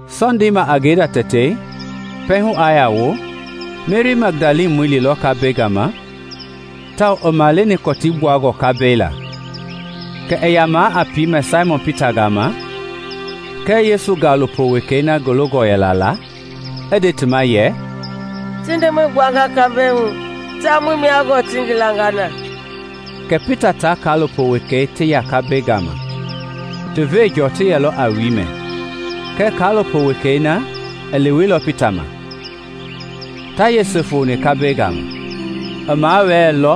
Sɔndei ma a ngenda tɛtei, pɛiŋ hu i yaa wo, Meri Magdalamɔi i liilɔ kambɛi gama tawao i maleni kɔtii gbuangɔ kambɛi laa. Kɛ i ya a piimɛ Saimɔn Pita gama kɛɛ Yesu gaalopo wekei na ngi longɔ yɛla la, i nde ti ma yɛ, “Ti Ndemɔi gbuanga kambɛi hu, tawao muii mia gɔɔ ti ngi langa na.” Kɛ Pita tia kaalopo wekei ti ya kambɛi gama. Ti veenjɔɔ ti yɛlɔ a wiimɛ kɛɛ kaalopo wekei na i leweilɔ Pita ma, ta yese i foo kambɛi gama. I mawɛɛlɔ,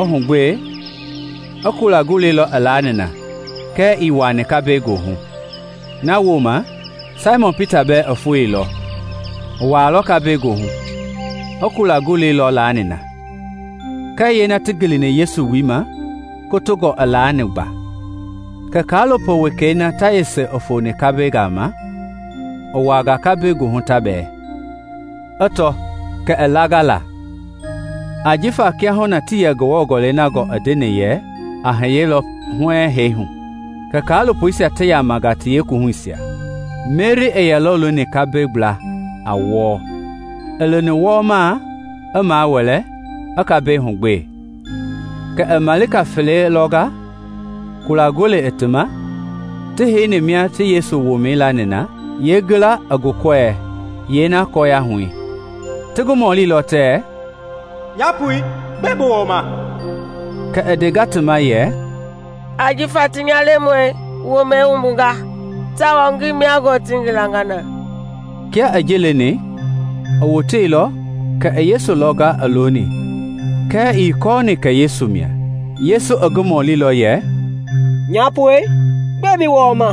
i hugbee, i kula golei lɔ i laani na kɛɛ ii wuaani kambɛi goohu. Na wooma Saimɔn Pita bɛɛ i foeilɔ, i wuaa kambɛi goohu, i kula golei lɔ laani na, kɛɛ yeena ti ngilini Yesu wui ma kotongɔ i laani gba. Kɛ kaalopo wekei na ta yese i foni kambɛi gama i wuaanga kohu ta bɛɛ, i tɔ, kɛ i langa la; ( ajifa kiahuna tii yɛ Ngewɔ Gɔlɛi na gɔɔ i ndeni yɛ a hiyelɔ huɛɛŋ hee hu.) Kɛ kaalopoisia ti yamanga ti yeekuwuhuisia. Meri yɛlɔ looni kambɛi gbla a wɔɔ. I loni wɔɔmaa, i mawɛlɛ, i kambɛi hugbee; kɛ i malika fele lɔnga, kula golei i ti ma, ti heini mia Yesu womɛi i yɛ laani na, yeengila i wukɔɛi, yeena i kɔɔyahui. Ti ngi mɔlilɔ tɛɛ, “Nyapoi, gbɛe bi wɔɔma?” Kɛ i ndenga ti ma yɛ, “Ajifa ti nya Lemɔi womɛi wumbunga, tawao ngii mia gɔɔ ti ngi langa na.” Kia i ji leni, i woteilɔ kɛ i Yesu lɔnga i looni kɛɛ ii kɔɔni kɛ Yesu mia. Yesu i ngi mɔlilɔ yɛ, “Nyapoi, gbɛe bi wɔɔma?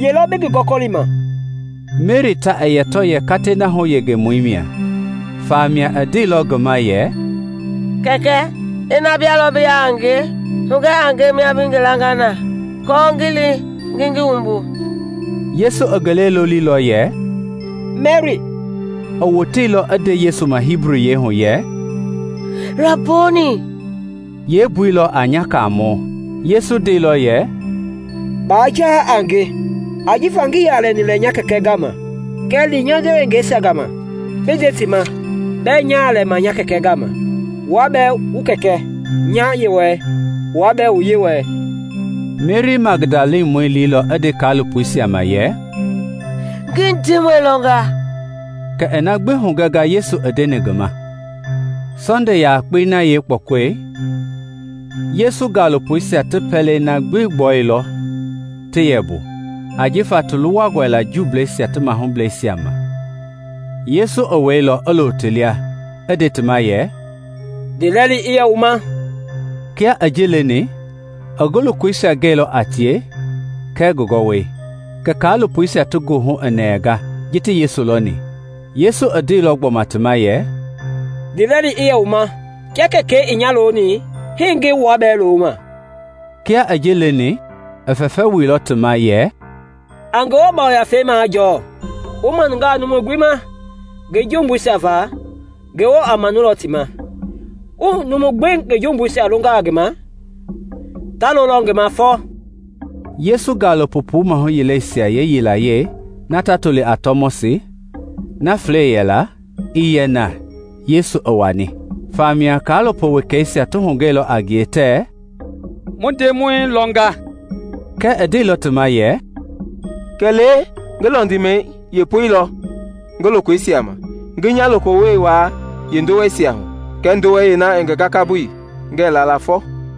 Ye lɔ bi ngi gɔkɔlima?” Meri ta i yɛ tɔ yɛ katei na yeengengemɔi mia, famia i ndeilɔ ngi ma yɛ, “Kɛkɛ, ina bia lɔ bi ya a ngie, hugɛ a nge mia bi ngi langa na aako ngi li ngi gi wumbu.” Yesu i ngi lɛi loliilɔ yɛ, “Meri.” I woteilɔ i nde Yesu ma Hibuyiɛi hu yɛ, “Raboni!” (yeembui lɔ a nya Kaamɔ.) Yesu ndeilɔ yɛ, “Baa vɛmbɛ a nge, ajifa ngii yaa lɛni lɛ nya Kɛkɛ gama; kɛɛ li nya ndewengeisia gama bi nde ti ma bɛɛ nyaa lɛma nya Kɛkɛ gama, wua bɛɛ wu Kɛkɛ, nya Yewɔɛi, wua bɛɛ wu Yewɔɛi.” Meri Magdalamɔi i liilɔ i nde kaalopoisia ma yɛ, “Ngi Ndemɔi lɔnga;” kɛ i na gbi hugɛnga Yesu i ndeni ngi ma. Sɔnde yakpei na yeekpɔkɔi, Yesu gaalopoisia ti pɛlei na gbi gbɔwuilɔ ti yɛ mbu ajifa ta luwa Juuisia ti mahublɛisia ma. Yesu i weilɔ, i lo ti lia, i nde ti ma yɛ, “Ndiilɛli i yɛ wu ma.” Kia i ji leni, i ngi lokoisia gɛilɔ a tie kɛɛ ngi gakamɛi. Kɛ kaalopoisia ti goohu i nɛnga ji ti Ndemɔi lɔni. Yesu i ndeilɔ gbɔma ti ma yɛ, “Ndiilɛli i yɛ wu ma. Kia Kɛkɛi i nya loni, hii ngi wua bɛɛ loma.” Kia i ji leni, i fɛfɛi wuilɔ ti ma yɛ, “A Ngewɔ Yafei majɔɔ. Wu manungaa numu gbi jumbuisia ma, Ngewɔ a maanulɔ ti ma; wu numu gbi jumbuisia longaa ngi ma, ta lolɔ ngi ma fɔ.” Yesu gaalopo puu maahu yileisia yilayee ta toli a Tɔmɔsi, na Flɛi yɛla, ii yɛ na Yesu i wani. Famia kaalopo wekeisia ti hugɛilɔ a ngie tɛɛ, “Mu Ndemɔi lɔnga.” Kɛɛ i ndeilɔ ti ma yɛ, “Kɛlee ngi lɔndimɛi yeepoi lɔ ngi lokoisia ma, ngi nya lokoyiwoi wuaa yeendoweisia hu kɛɛ ndowei yeena i ngi gakabui, ngɛɛ la la fɔ.”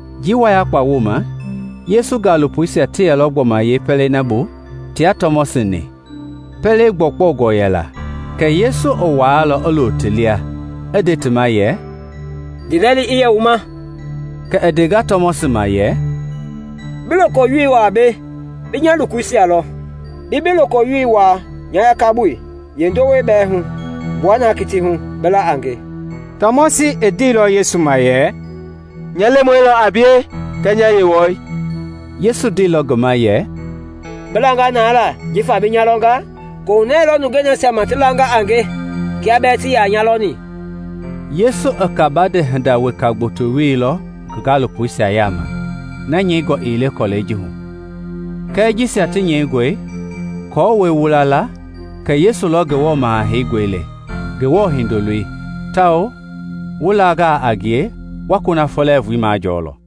Njii wayakpa wooma Yesu gaalopoisia ti yɛlɔ gbɔma yeepɛlei na bu tia Tɔmɔsi-ni. Pɛlei gbi gbɔwungɔ yɛla, Kɛɛ Yesu i wɛilɔ i lo ti lia, i nde ti ma yɛ, “Ndiilɛli i yɛ wu ma.” Kɛ i ndenga Tɔmɔsi ma yɛ, “Bi lokoyiwoi wuaa mbei bi nya lokoisia lɔ, bi bi lokoyiwoi wuaa nya gakabui yeendowei bɛɛ hu. Gbua na kitii hu bi la a nge.” Tɔmɔsi i ndeilɔ Yesu ma yɛ, “Nya Lemɔi lɔ a bie kɛɛ nya Yewɔɛi!” Yesu ndeilɔ ngi ma yɛ, “Bi langa na la jifa bi nya lɔnga? Kohunɛ lɔ nungei nasia ma ti langa a nge kia bɛɛ ti yaa nya lɔni.” Yesu i kabande hinda weka gboto wielɔ ngi gaalopoisia yaama, nyɛingɔ ii le bukui ji hu; kɛɛ jisia ti nyɛingɔe aako wu la la kɛ Yesu lɔ Ngewɔ Maha Heingɔi le, Ngewɔ Hindoloi, tawao wu langaa a ngie, wa kunafɔ lɛɛvui majɔɔ lɔ.